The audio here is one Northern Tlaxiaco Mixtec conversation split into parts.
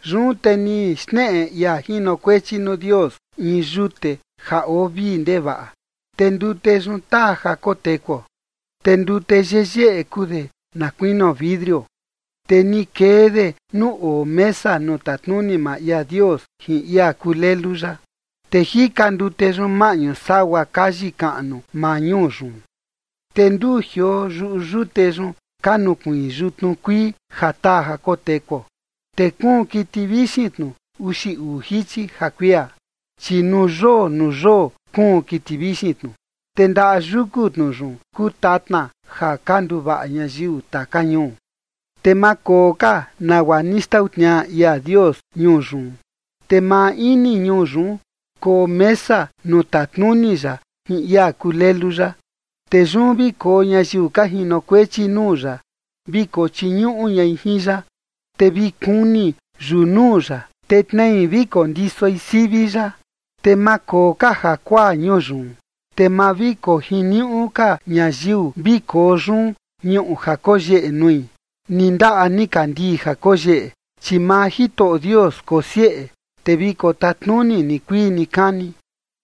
Yun te ni xneꞌe ia jinokuechi nuu Dios in yute ja oo vii ndevaꞌa, te ndute yun taa ja kotekuo. Te ndute yeyeꞌe kuu de, na kuinio vidrio, te ni kee de nuu oo mesa nuu tatnuni maa ia Dios jin ia kuu Lelu ya. Te jika ndute yun maꞌñu sagua kayi kaꞌnu maa ñuu yun, te nduu jioo yuꞌu yute yun, ka nukuiin yutnu kuii ja taa ja kotekuo. Te kuun kiti vixin tnu uxi uu jichi ja kuia, chi nuu yoo nuu yoo kuun kiti vixin tnu. Te ndaꞌa yuku tnu yun kuu tatna ja ka nduvaꞌa ñayiu taka ñuu. Te ma koo ka nagua ni xtau tniaꞌa ia Dios ñuu yun. Te maa ini ñuu yun koo mesa nuu tatnuni ya jin ia kuu Lelu ya. Te yun vi koo ñayiu ka jinokuechi nuu ya vi kochiñuꞌu ñai jin ya. Te vi kuni yunuu ya, te tnei vi kondisoi sivi ya. Te ma koo ka jakuaa ñuu yun, te ma vi kojiniuꞌu ka ñayiu vi koo yun ñuꞌu ja koyeꞌe nui, ni ndaꞌa nikandii ja koyeꞌe, chi maa Jitoꞌo Dios kosieꞌe, te vi kotatnuni nikuii nikani.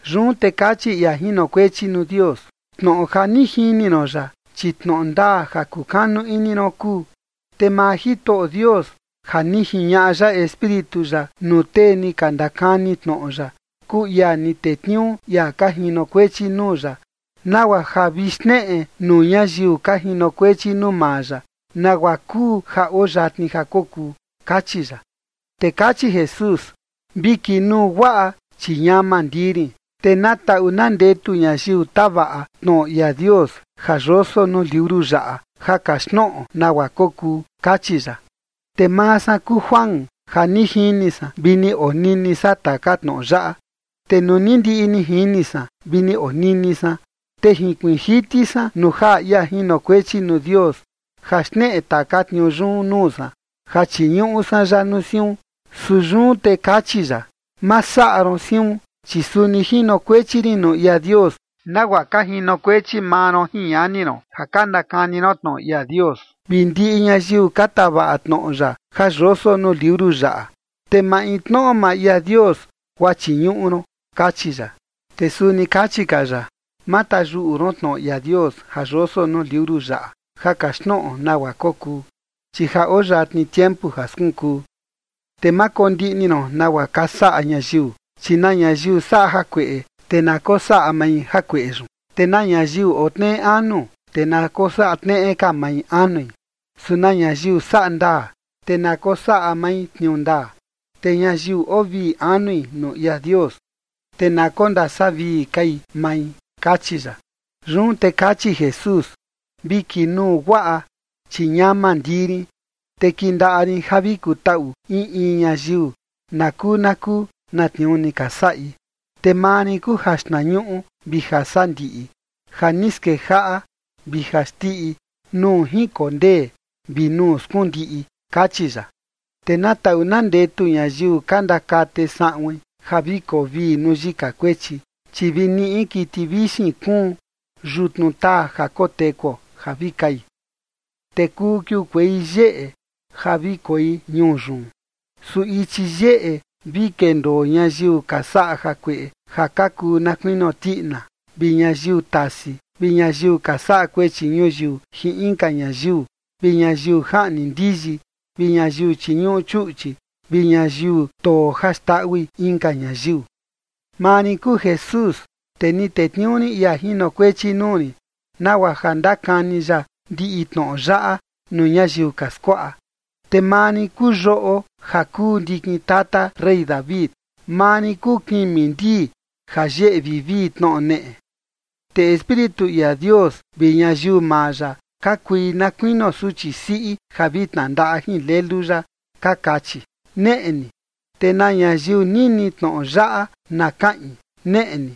Yun te kachi ia jinokuechi nuu Dios: ―Tnoꞌo ja ni jini ron yaꞌa, chi tnoꞌo ndaa ja kukanu ini ron kuu. Te maa Jitoꞌo Dios ja ni jiñaꞌa ya Espíritu ya nuu tee ni ka ndakani tnoꞌo ya, kuu ia ni tetniuu ia ka jinokuechi nuu ya, nagua ja vi xneꞌe nuu ñayiu ka jinokuechi nuu maa ya nagua kuu ja oo yatni ja kokuu ―kachi ya. Te kachi Jesús: ―Vi kinuu guaꞌa, chi ñama ndii rin, te na taꞌu na ndetu ñayiu tavaꞌa tnoꞌo ia Dios ja yoso nuu liuru yaꞌa ja kaxtnoꞌo nagua kokuu ―kachi ya. Te maa san kuu Juan ja ni jini san vi ni onini san taka tnoꞌo yaꞌa. Te nuu ni ndiꞌi ni jini san vi ni onini san, te jinkuiin jiti san nuu jaꞌa ia jinokuechi nuu Dios ja xneꞌe taka tniuu yun nuu san ja chiñuꞌu san ya nuu siun. Su yun te kachi ya: ―Ma saꞌa ron siun, chi suni jinokuechi rin nuu ia Dios, nagua ka jinokuechi maa ron jin ñani ron ja ka ndakani ron tnoꞌo ia Dios, vi ndiꞌi ñayiu ka tavaꞌa tnoꞌo ya ja yoso nuu liuru yaꞌa. Te maintnoꞌo maa ia Dios guaa chiñuꞌu ron ―kachi ya. Te suni kachi ka ya: ―Ma tayuꞌu ron tnoꞌo ia Dios ja yoso nuu liuru yaꞌa ja kaxtnoꞌo nagua kokuu, chi ja oo yatni tiempu ja skunkuu. Te ma kondiꞌni ron nagua ka saꞌa ñayiu, chi na ñayiu saꞌa jakueꞌe, te na kosaꞌa mai jakueꞌe yun. Te na ñayiu oo tneꞌe anu, te na kosaꞌa tneꞌe ka mai anui. Su na ñayiu saꞌa ndaa, te na kosaꞌa mai tniuu ndaa. Te ñayiu oo vii anui nuu ia Dios, te na kondasavii kai mai ―kachi ya. Yun te kachi Jesús: ―Vi kinuu guaꞌa, chi ñama ndii rin, te kindaꞌa rin ja vi kutaꞌu in in ñayiu, nakuu nakuu na tniuu ni ka saꞌi. Te maa rin kuu jaxtnañuꞌu vi jasandiꞌi, ja ni skejaꞌa vi jaxndiꞌi, nuu jinkondee vi nuu skundiꞌi ―kachi ya. Te na taꞌu na ndetu ñayiu ka ndakate saꞌuin ja vi koo vii nuu yika kuechi, chi vi niꞌi kiti vixin kuun yutnu taa ja kotekuo ja vi kai, te kuu kiukuei yeꞌe ja vi koi ñuu yun. Su ichi yeꞌe vi kendoo ñayiu ka saꞌa jakueꞌe ja ka kuu na kuinio tiꞌina, vi ñayiu tasi, vi ñayiu ka saꞌa kuechi ñuyiu jin inka ñayiu, vi ñayiu jaꞌni ndiyi, vi ñayiu chiñuꞌu chuꞌchi, vi ñayiu too ja xndaꞌui inka ñayiu. Maa rin kuu Jesús, te ni tetniuu rin ia jinokuechi nuu rin nagua ja ndakani ya ndiꞌi tnoꞌo yaꞌa nuu ñayiu ka skuaꞌa. Te maa rin kuu yoꞌo ja kuu ndikin tata rey David. Maa rin kuu kimi ndii ja yeꞌe vivii tnoꞌo neꞌe. Te Espíritu ia Dios vi ñayiu maa ya ka kui na kuinio suchi siꞌi ja vi tnandaꞌa jin Lelu ya ka kachi: ―Neꞌe ni. Te na ñayiu nini tnoꞌo yaꞌa na kaꞌin: ―Neꞌe ni.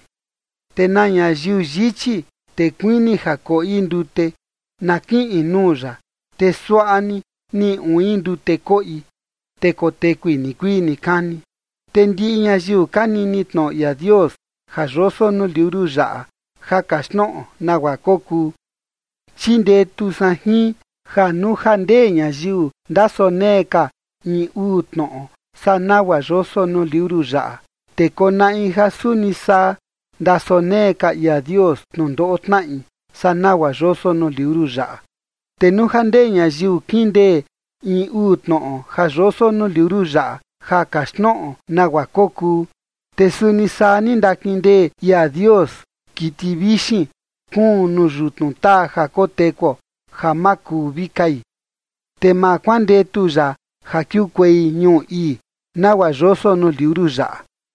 Te na ñayiu yichi, te kuini ja koꞌi ndute, na kiꞌin nuu ya, te suaꞌa ni niꞌi uin ndute koꞌi, te kotekui nikuii nikani. Te ndiꞌi ñayiu ka nini tnoꞌo ia Dios ja yoso nuu liuru yaꞌa ja kaxtnoꞌo nagua kokuu, chindetu san jin, ja nuu ja ndee ñayiu ndasonee ka in uu tnoꞌo saa nagua yoso nuu liuru yaꞌa, te konaꞌi ja suni saa ndasonee ka ia Dios tnundoꞌo tnaꞌi saa nagua yoso nuu liuru yaꞌa. Te nuu ja ndee ñayiu kindee in uu tnoꞌo ja yoso nuu liuru yaꞌa ja kaxtnoꞌo nagua kokuu, te suni saa ni ndakindee ia Dios kiti vixin kuun nuu yutnu taa ja kotekuo ja ma kuu vi kai, te ma kuandetu ya ja kiukuei ñuu ii, nagua yoso nuu liuru yaꞌa.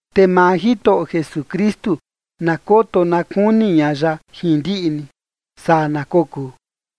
Te maa Jitoꞌo Jesukristu na koto na kuni ña ya jin ndiꞌi ni. Saa na kokuu.